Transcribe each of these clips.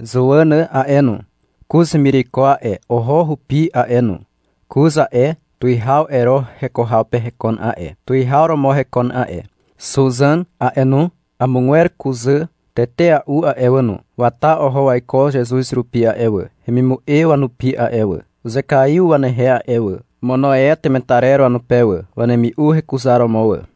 Zuànà a'e no, Kuz hemireko a'e, oho hupi a'e no. Kuz a'e, tuwihaw Ero heko haw pe hekon a'e, tuwihaw romo hekon a'e. Xuzàn a'e no, amogwer kuzà tetea'u a'e wà no, wata oho waiko Zezuz rupi a'e wà, hemimu'e wanupi a'e wà. Uzekaiw wanehe a'e wà. Omono e temetarer wanupe wà, wanemi'u hekuzaromo wà.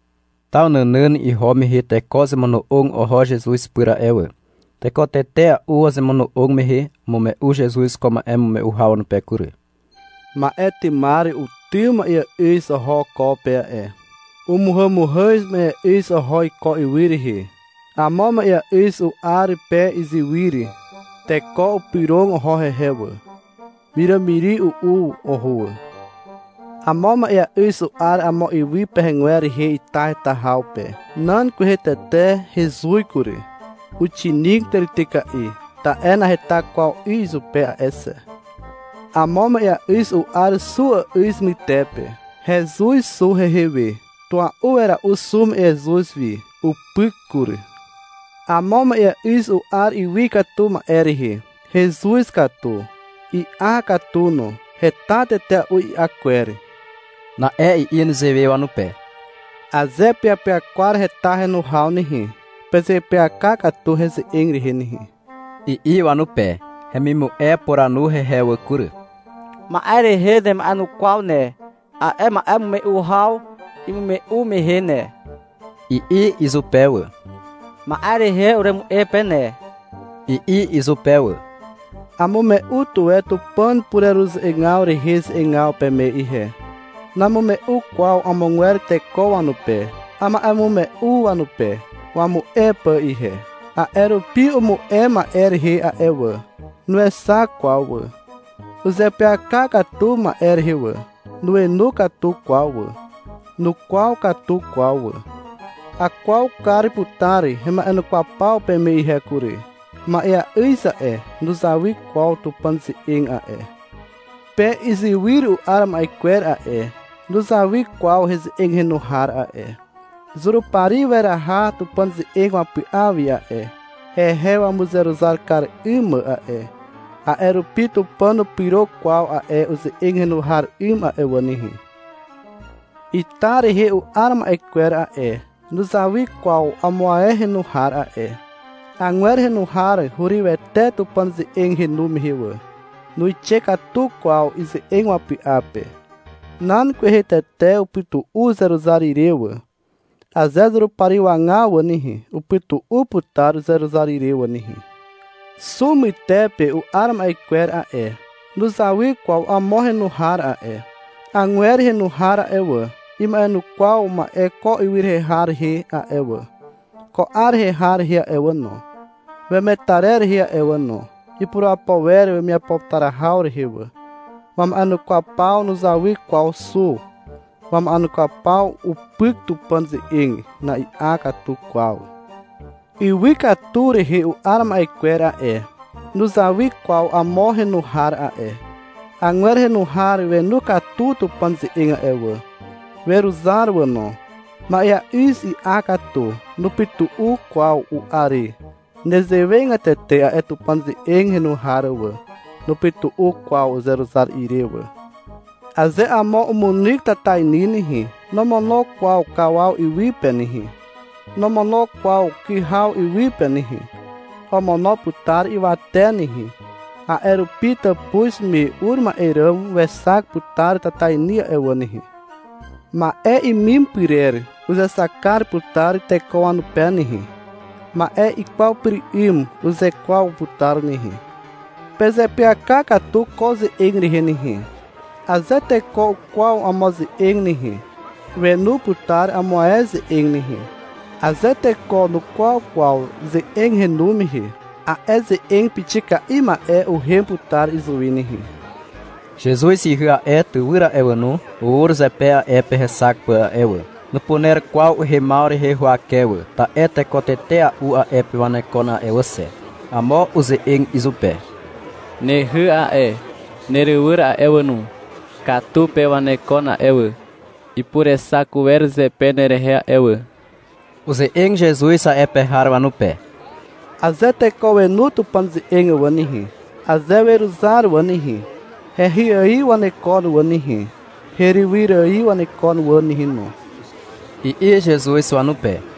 Taw nànàn iho mehe teko uzemono'og oho Zezuz pyr a'e wà. Teko tetea'u wazemono'og mehe, umume'u Zezuz ko ma'emume'u haw wanupe kury. — Ma'e tymar utym ma'eà'yz oho oko pe a'e. Umuhàmuhàz ma'eà'yz oho iko ywy rehe. Amo ma'eà'yz u'ar pe izywyr. Teko upyrog oho hehe wà. Wiràmiri u'u oho wà. Amo ma'eà'yz u'ar amo ywy pehegwer rehe ita heta haw pe. Nan kwehe tete hezuz kury. Uxinig tàrityka'i, ta'e naheta kwaw 'y izupe a'e xe. Amo ma'eà'yz u'ar xu à'yz mytepe. Hezuz xu hehe we. Tua'u wera'u xu ma'ezuz wi. Upyk kury. Amo ma'eà'yz u'ar ywy ikatu ma'e rehe. Hezuz katu. I'a katu no. Heta tetea'u i'a kwer. Na'e i'i nezewe wanupe. — Aze peapyakwar heta henu haw nehe, pezeapyaka katu heze'eg rehe nehe, i'i wanupe. Hemimu'e upuranu hehe wà kury. — Ma'e rehe nema'enukwaw ne, a'e ma'emume'u haw imume'u mehe ne, i'i izupe wà. — Ma'e rehe uremu'e pe ne, i'i izupe wà. Amume'u tuwe Tupàn pureruze'egaw rehe ze'egaw peme ihe. Namume'u kwaw amogwer teko wanupe. Ama'emume'u wanupe, wamu'e pà ihe. A'e rupi ume'e ma'e rehe a'e wà, nuexak kwaw wà. Uzeapyaka katu ma'e rehe wà, nuenu katu kwaw wà, (nukwaw katu kwaw wà). Akwaw kar putar hema'enukwaw paw peme ihe kury. Ma'eà'yz a'e, nuzawy kwaw Tupàn ze'eg a'e. Pe izywyr u'ar ma'e kwer a'e, nuzawy kwaw ze'eg henu har a'e. Zurupari weraha Tupàn ze'eg wapy'a wi a'e, hehe wamuzeruzar kar 'ym mà a'e. A'e rupi Tupàn nupyro kwaw a'e uze'eg henu har 'ym a'e wà nehe. Ita rehe u'ar ma'e kwer a'e, nuzawy kwaw amo ae henu har a'e. Agwer henu har hurywete Tupàn ze'eg henu mehe wà. Nuixe katu kwaw ize'eg wapy'a pe. Nan kwehe tete upytu'u uzeruzar ire wà. Aze Zurupari wagaw wà nehe, upytu'u putar uzeruzar ire wà nehe. Xu mytepe u'ar ma'e kwer a'e, nuzawy kwaw amo henu har a'e. Agwer henu har a'e wà, ima'enukwaw ma'e ko ywy rehe har rehe a'e wà, ko 'ar rehe har rehe a'e wà no, wemetarer rehe a'e wà no. Ipurapo wer wemiapo putar haw rehe wà. Wama'enukwaw paw nuzawy kwaw xu. Wama'enukwaw paw upyk Tupàn ze'eg. Na'i'a katu kwaw. Ywy katu rehe u'ar ma'e kwer a'e, nuzawy kwaw amo henu har a'e. Agwer henu har wenu katu Tupàn ze'eg a'e wà, weruzar wà no. Ma'eà'yz i'a katu, nupytu'u kwaw u'a re. Nezewegatete a'e Tupàn ze'eg henu har wà, nupytu'u kwaw uzeruzar ire wà. Aze amo umunyk tatainy nehe, nomono kwaw kawaw iwy pe nehe, nomono kwaw kyhaw iwy pe nehe. Omono putar ywate nehe, a'e rupi tàpuz me ur ma'e ràm wexak putar tatainy a'e wà nehe. Ma'e imim pyrer uzexak kar putar teko wanupe nehe. Ma'e ikwaw pyr 'ym uzekwaw putar nehe. Pezeapyaka katu ko ze'eg rehe nehe. Aze teko ukwaw amo ze'eg nehe, wenu putar amo ae ze'eg nehe. Aze teko nukwaw kwaw ze'eg henu mehe, a'e ze'eg pixika'i ma'e uhem putar izuwi nehe. Zezuz ihy a'e, tywyr a'e wà no, ur zepe a'e pe hexak pà a'e wà. Nupuner kwaw uhemaw rehe huwake wà, ta'e teko tetea'u a'e pe wanekon a'e wà xe. Amo uze'eg izupe. Nehy a'e, nerywyr a'e wà no, katu pe wanekon a'e wà, ipurexak wer zepe nerehe a'e wà. Uze'eg Zezuz a'e pe har wanupe. — Aze teko wenu Tupàn ze'eg wà nehe, aze weruzar wà nehe, hehy ài wanekon wà nehe, herywyr ài wanekon wà nehe no, i'i Zezuz wanupe.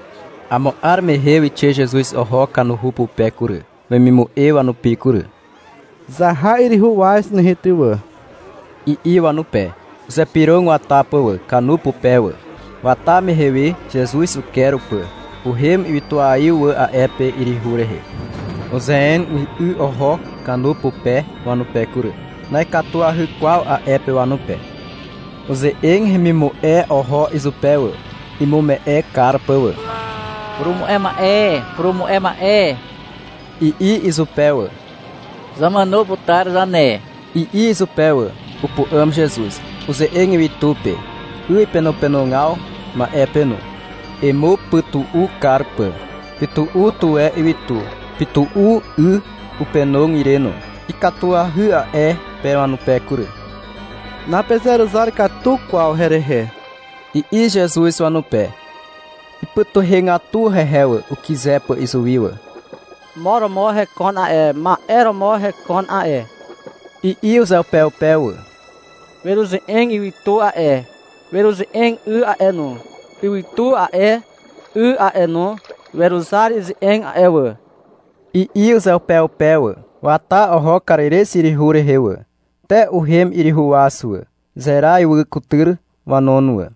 Amo 'ar mehe wixe Zezuz oho kanuhu pupe kury, wemimu'e wanupi kury. — Zaha yryhu waz nehe ty wà, i'i wanupe. Uzypyrog wata pà wà, kanu pupe wà. Wata mehe we Zezuz uker upà. Uhem ywytuaiw wà a'e pe yryhu rehe. Uzeen 'y oho kanu pupe wanupe kury. Na'ikatuahy kwaw a'e pe wanupe. Uze'eg hemimu'e oho izupe wà, imume'e kar pà wà. Purumu'e ma'e, purumu'e ma'e, i'i izupe wà. — Zamàno putar zane, i'i izupe wà. Upu'àm Zezuz. Uze'eg ywytu pe, 'y ipenopenog ma'e pe no, imupytu'u kar pà. Upytu'u tuwe ywytu, upytu'u 'y upenog ire no. Ikatuahy a'e pe wanupe kury. Napezeruzar katu kwaw herehe, i'i Zezuz wanupe. Ipytuhegatu hehe wà, ukyze pà izuwi wà. Mo romo hekon a'e, ma'e romo hekon a'e, i'i uzeupeupe wà. Weruze'eg ywytu a'e, weruze'eg 'y a'e no. Ywytu a'e, 'y a'e no, weruzar ize'eg a'e wà, i'i uzeupeupe wà. Wata oho Karirez yryhu rehe wà, te uhem yryhu waz wà. Zera ywy kutyr wanon wà.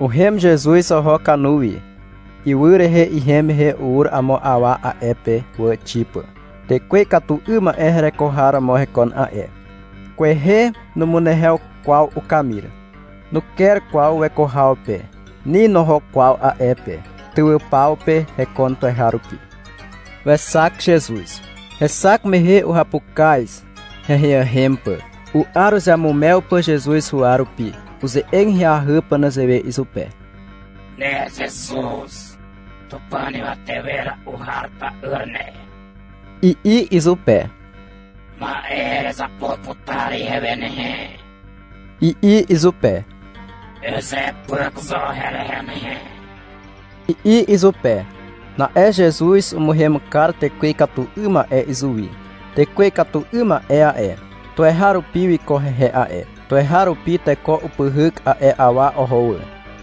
Uhem Zezuz oho kanu wi. Ywy rehe ihem mehe ur amo awa a'e pe huwàxi pà. Tekwe ikatu 'ym ma'e hereko har romo hekon a'e. Kwehe numunehew kwaw ukamir. Nuker kwaw weko haw pe, ni noho kwaw a'e pe. Tywypaw pe hekon tuweharupi. Wexak Zezuz. Hexak mehe uhapukaz heiheihem pà. U'ar uzeamumew pà Zezuz huwa rupi, uze'eg ahyahy pà nezewe izupe. Ne Zezuz, Tupàn Ywate Wera'u Har ta'yr ne, i'i izupe. — Ma'e erezapo putar ihewe nehe, i'i izupe. — Ezepyk zo herehe nehe, i'i izupe. Na'e Zezuz umuhem kar tekwe ikatu 'ym ma'e izuwi. Tekwe ikatu 'ym ma'e a'e, tuweharupi wiko hehe a'e. Tuweharupi teko upyhyk a'e awa oho wà,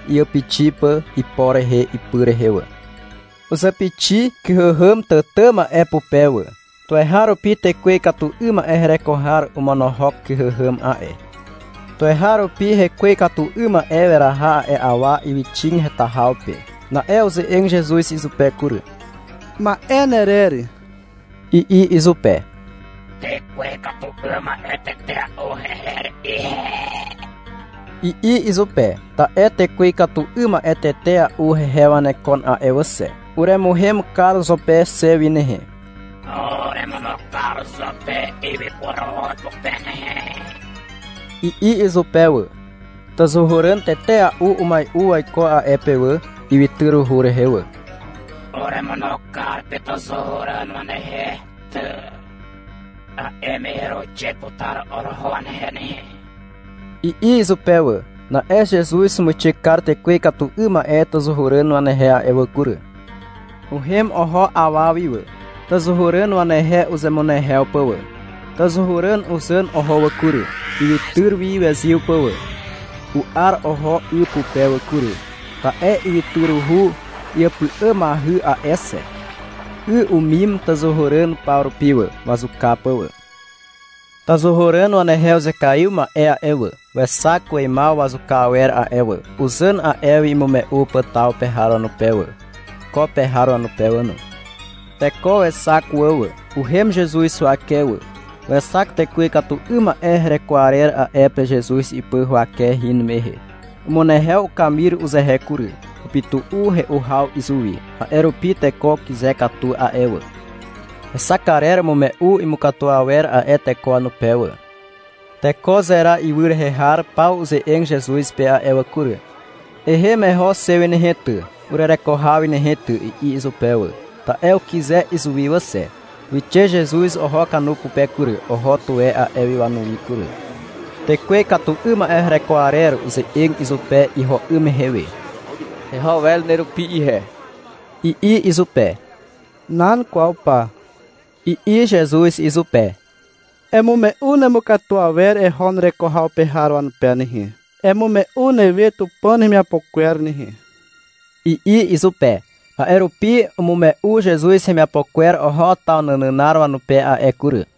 iàpixi pà ipo rehe ipy rehe wà. Uzàpixi kyhàhàm tàtà ma'e pupe wà. Tuweharupi tekwe ikatu 'ym ma'e hereko har omonohok kyhàhàm a'e. Tuweharupi hekwe ikatu 'ym ma'e weraha a'e awa ywyxig heta haw pe. Na'e uze'eg Zezuz izupe kury. — Ma'e nerer, i'i izupe. — Tekwe ikatu 'ym ma'e tetea'u herer ihe, i'i izupe, (ta'e tekwe ikatu 'ym ma'e tetea'u hehe wanekon a'e wà xe). — Uremuhem kar zo pe xe wi nehe, uremono kar zo pe ywykwaruhu pupe nehe, i'i izupe wà. Tàzàhuràn tetea'u umai'u waiko a'e pe wà, ywytyruhu rehe wà. — Uremono kar pe tàzàhuràn wanehe ty, a'e mehe uruixe putar oroho wanehe nehe, i'i izupe wà. Na'e Zezuz umuixe kar tekwe ikatu 'ym ma'e tàzàhuràn wanehe a'e wà kury. Uhem oho awa wi wà, tàzàhuràn wanehe uzemunehew pà wà. Tàzàhuràn uzàn oho wà kury, ywytyr wi wezyw pà wà. U'ar oho 'y pupe wà kury. Ta'e ywytyruhu iàpy'àmahy a'e xe. 'Y umim tàzàhuràn paw rupi wà, wazuka pà wà. Tàzàhuràn wanehe uzekaiw ma'e a'e wà, wexak weimaw wazuka awer a'e wà. Uzàn a'e wi imume'u pà taw pe har wanupe wà, ko pe har wanupe wà no. Teko wexak wà wà. Uhem Zezuz huwake wà. Wexak tekwe ikatu 'ym ma'e hereko arer a'e pe Zezuz ipy huwake hin mehe. Umunehew ukamir uzehe kury. Upytu'u he'o haw izuwi. A'e rupi teko ukyze katu a'e wà. Hexak arer umume'u imukatu awer a'e teko wanupe wà. Teko Zera ywy rehe har paw uze'eg Zezuz pe a'e wà kury. — Ehem eho xe wi nehe ty, urereko haw wi nehe ty, i'i izupe wà, ta'e ukyze izuwi wà xe. Wixe Zezuz oho kanu pupe kury. Oho tuwe a'e wi wanuwi kury. Tekwe ikatu 'ym ma'e hereko arer uze'eg izupe iho 'ym mehe we. — Heho wer nerupi ihe, i'i izupe. — Nan kwaw pa, i'i Zezuz izupe. — Emume'u nemukatu awer eho nereko haw pe har wanupe nehe, emume'u newe Tupàn hemiapo kwer nehe, i'i izupe. A'e rupi umume'u Zezuz hemiapo kwer oho taw nànànar wanupe a'e kury.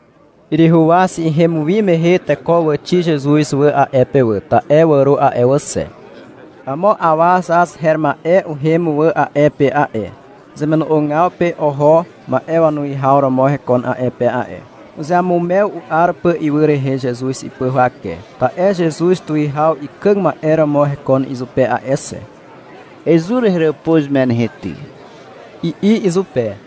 Yryhu waz ihem wi mehe teko uwàxi Zezuz wà a'e pe wà, ta'e wàro a'e wà xe. Amo awa Zaz her ma'e uhem wà a'e pe a'e. Zemono'ogaw pe oho ma'e wanuwihaw romo hekon a'e pe a'e. Uzeamumew u'ar pà ywy rehe Zezuz ipy huwake, (ta'e Zezuz tuwihaw ikàg ma'e romo hekon izupe a'e xe.) — Ezur heràpuz me nehe ty, i'i izupe.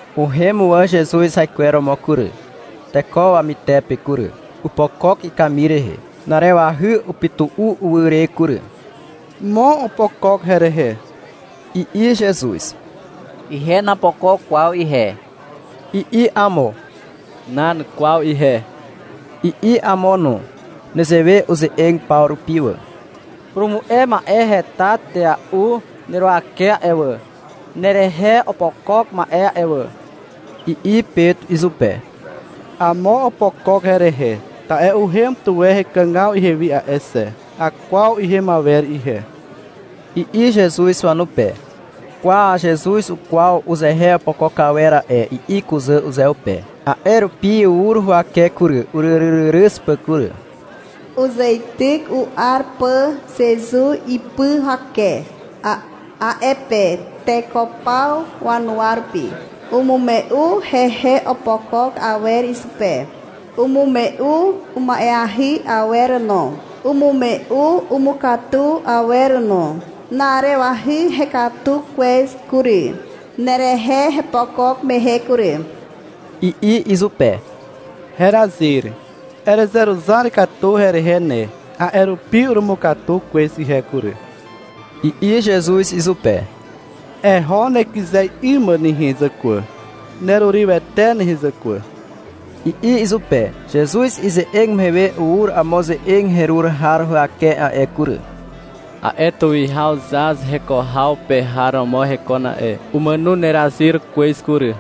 Uhem wà Zezuz haikweromo kury, teko wamytepe kury. Opokok ikamir rehe. Na'arewahy upytu'u uwy re kury. — Mo opokok herehe, i'i Zezuz. Ihe napokok kwaw ihe, i'i amo. — Nan kwaw ihe, i'i amo no. Nezewe uze'eg paw rupi wà. — Purumu'e ma'e, heta tetea'u teko neruwake a'e wà, nerehe opokok ma'e a'e wà, i'i Pet izupe. — Amo opokok herehe, ta'e uhem tuwe hekàgaw ihewi a'e xe, akwaw ihem awer ihe, i'i Zezuz wanupe. — Kwa, Zezuz ukwaw uzehe hepokok awer a'e, i'i kuzà uzeupe. A'e rupi ur huwake kury, uryryz pà kury. Uzeityk u'ar pà Zezuz ipy huwake. A'e pe, teko paw wanuwa rupi, umume'u hehe opokok awer izupe, umume'u uma'eahy awer no, umume'u umukatu awer no. — Na'arewahy hekatu kwez kury, nerehe hepokok mehe kury, i'i izupe. — Herazyr, erezeruzar katu herehe ne, a'e rupi urumukatu kwez ihe kury, i'i Zezuz izupe. — Eho nekyze 'ym mà nehe, zàkwà. Nerurywete nehe zàkwà, i'i izupe. Zezuz ize'eg mehe we ur amo ze'eg herur har huwake a'e kury. A'e tuwihaw Zaz heko haw pe har romo hekon a'e. — Umàno nerazyr kwez kury,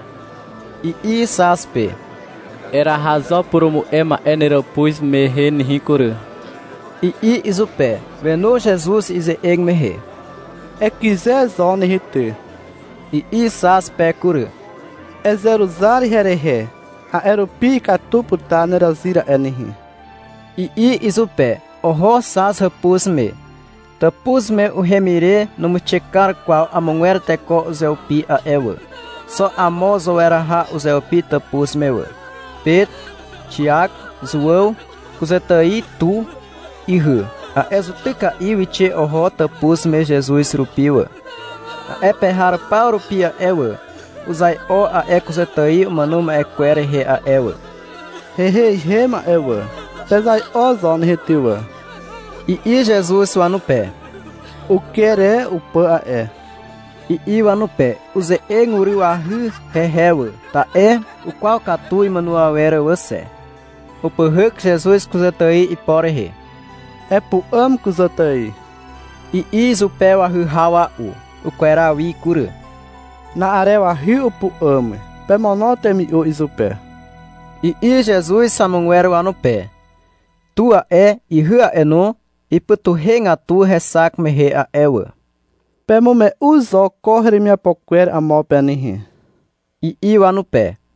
i'i Zaz pe. — Eraha zo purumu'e ma'e neràpuz mehe nehe kury, i'i izupe. Wenu Zezuz ize'eg mehe. — Ekyze zo nehe ty, i'i Zaz pe kury. — Ezeruzar herehe, a'e rupi ikatu putar nerazyr a'e nehe, i'i izupe. (Oho Zaz hàpuz me.) Tàpuz me uhem ire, numuixe kar kwaw amogwer teko uzeupi a'e wà. Xo amo zo weraha uzeupi tàpuz me wà: Pet, Xiak, Zuàw, kuzàtài tu, ihy. A'e zutyka'i wixe oho tàpuz me Zezuz rupi wà. A'e pe har paw rupi a'e wà, uzai'o a'e kuzàtài umàno ma'e kwer rehe a'e wà. Heiheihem a'e wà. — Pezai'o zo nehe ty wà, i'i Zezuz wanupe. — Uker e upà a'e, i'i wanupe. Uze'eg urywahy hehe wà, ta'e ukwaw katu imàno awer wà xe. Upyhyk Zezuz kuzàtài ipo rehe. — Epu'àm, kuzàtài, i'i izupe wahyhawa'u. Ukweraw wi kury. Na'arewahy upu'àm. — Pemono temi'u izupe, i'i Zezuz amogwer wanupe. Tu a'e, ihy a'e no, ipytuhegatu hexak mehe a'e wà. — Pemume'u zo ko heremiapo kwer amo pe nehe, i'i wanupe.